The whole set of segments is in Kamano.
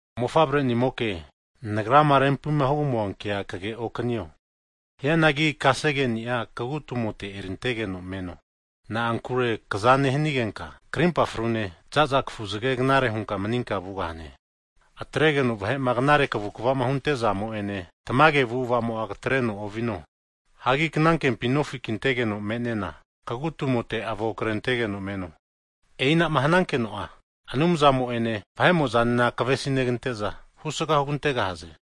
Mofavrenimoke, nagrama rempima hugamua kea kage'okanio. Hianagi kasegeni'a kagu'tumote erintegeno meno. Na'ankure kaza nehanigenka, karimpa frune zaza kafuzge knare hunka maninka vugahane. Atregeno vahe'ma knare kavukvama huntezamo ene, tamage avu'avamo'a katreno ovino. Hagi knankempi nofi kintegeno me'nena kagu tumote avo krentegeno meno. E'inama hanankeno'a, Anumzamo'ene vahe'mozanena kavesineganteza, husga hugantegahaze.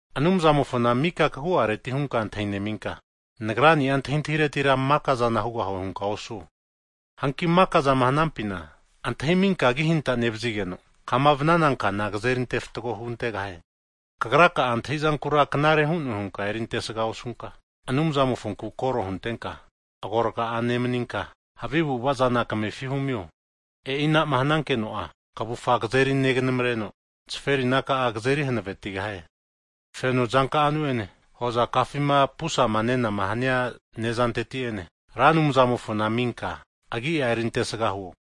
Anumzamofona mika kagu'areti hunka antahi'neminka, nagrani'a antahintahiretira makazana hugahue hunka osuo. Hanki mikazama hanampina antahiminka agihanta nevazigeno, vanana kana azeri ante fatgo hugantegahie. Kagraka'a antahizankura knare hu'ne hunka eri antesga osunka, Anumzamofonku koro huntenka agorga'a nemaninka, havi avu'avazana kamefi humio. E'i ana'ma hanankeno'a, kavufa kazeri neganamreno, zaferina ka'a kazeri hanavetigahie. Feno zanka'anu'ene hozakafima pusama nenama hania nezanteti'ene Ra Anumzamofona aminka, agia eriantesga huo.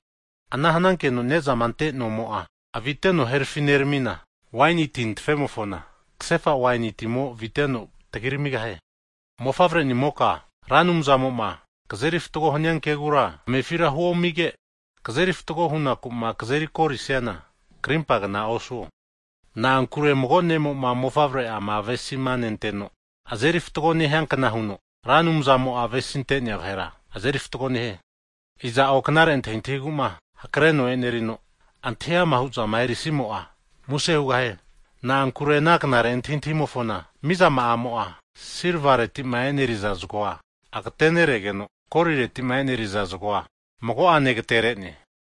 Ana hanankeno Anumzamo'a kaza nehina nezama ante nonka'amo'a aviteno herafi neramina, waini tintafemofona kasefa waini timo aviteno tagiramigahie. Mofavre'nimoka Ra Anumzamoma, kazeri fatgo hania kegura, kamefira huomige, kazeri fatgoma hunaku kazeri akorisiana karimpagna osuo. Na'ankure mago ne'mo'ma mofavre'ama avesima nenteno azeri fatgo nehiankna huno, Ra Anumzamo'a avesimantea vahera azeri fatgo nehie. Iza'o knare antahintahigu hakreno e'nerino, antahi ama'huzama erisimo'a, muse hugahie. Na'ankure ana knare antahintahimofona mizama'amo'a, silvaretima e'neriza zgoa agateneregeno, koliretima e'neriza zgoa, mago'ane agatere'ne.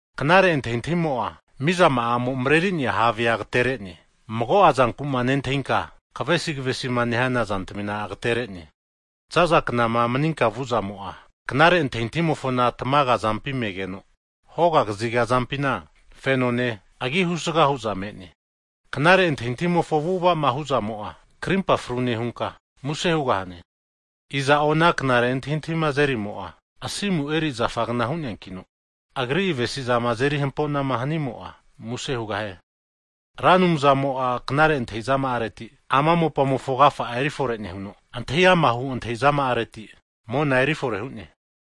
Knare antahintahimo'a mizama'amo mreri'nea havea agatere'ne, mago'a zankuma nentahinka kavesi kavesima nehana zantamina ageterene. Zaza knama maninka vuzamo'a, knare antahintahimofona tmaga azampi megeno, hoga kaziga azampina fenone, agi husaga hu'za me'ne. Knare antahintahimofo avu'avama huzamo'a, krimpafru nehunka muse hugahane. Iza'o ana knare antahintahima azerimo'a, asimu eri zafagna hu'neankino, agri avesizama azeri hampo'na hanimo'a muse hugahie. Ra Anumzamo'a knare antahi'zama'areti, ama mopamofo agafa'a erifore nehuno, antahi ama' hu antahizama'areti mona eri fore hu'ne.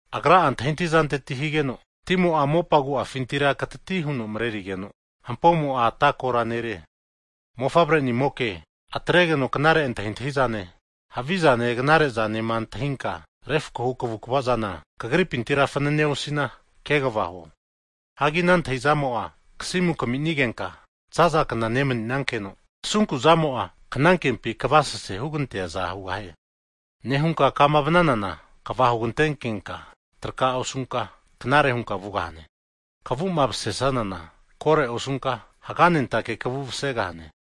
Agra'a antahizanteti higeno timo'a mopa agu'afintira katati huno marerigeno, hampomo'a atakora nerie. Mofavre'nimoke atregeno knare antahintahizane, havizane knare zanema antahinka refkohu kavukvazana kagripintira fanane osina, kegva huo. Hagi ana antahizamo'a kasimu kaminigenka zaza kna nemaninankeno, asunku'zamo'a knankempi kavasese huganteaza hugahie. Ana nehunka kama vananana, kva hugantenkenka traka osunka, knare hunka vugahane. Kavu'ma mase'sanana kore osunka, haga'nentake kavu masegahane.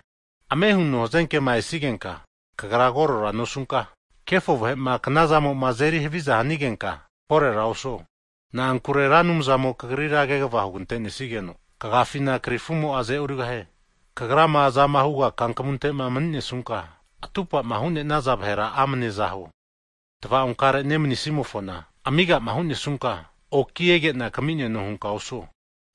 Ame huno hazenkema esigenka kagra korera nosunka, kefo vahe'ma knazamo'ma azeri haviza hanigenka, korera osuo. Na'ankure Ra Anumzamo kagrira kegva hugante'nesigeno, kagafina krifumo'a aze'origahie. Kagrama azama huga kankamunte'ma mni'nesunka, atupama hu'nenaza vahera amane aza huo. Tva'onkare nemni'simofona amigama hu'nesunka, oki ege'na kami'neno hunka osuo.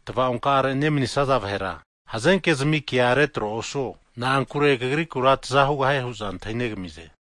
Tva'onkare nemnisaza vahera hazenke zamikea retro osuo. Na'ankure kagrikura taza hugahie hu'za antahinegamize.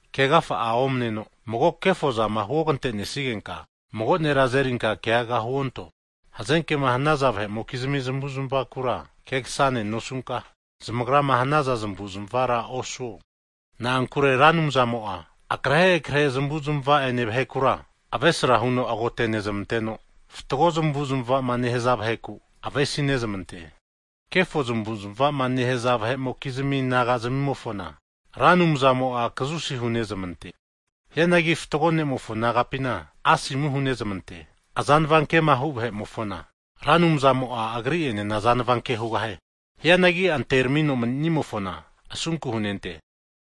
Kegafa'a omaneno, mago kefozama huogante'nesnigenka, mago nera azerinka keaga huonto. Hazenkema hanaza vahe'mokizmi zamavu'zmavakura kegasane nosunka, zamagrama hanaza zamavu'zmavara osuo. Na'ankure Ra Anumzamo'a akrehe krehe zmavu'zmava'ene vahekura avesra huno agote'nezmanteno, fatgo zmavu'zmavama nehaza vaheku avesi'nezmante. Kefo zamavu'zmavama nehaza vahe'mokizmi naga'zmimofona, Ra Anumzamo'a kazusi hunezmante. Hianagi fatgo ne'mofo nagapina asomu hunezmante. Vahe'mokizmima azanava kema huzmante vahe'mofona, Ra Anumzamo'a agri'enena azanava ke huntegahie. Hianagi anteramino manimofona, asunku hunente.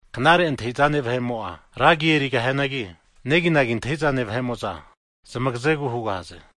Knare antahizane vahe'mo'a, ra agi erigahianagi, neginagi antahizane vahe'mo'za, zamagazegu hugahaze.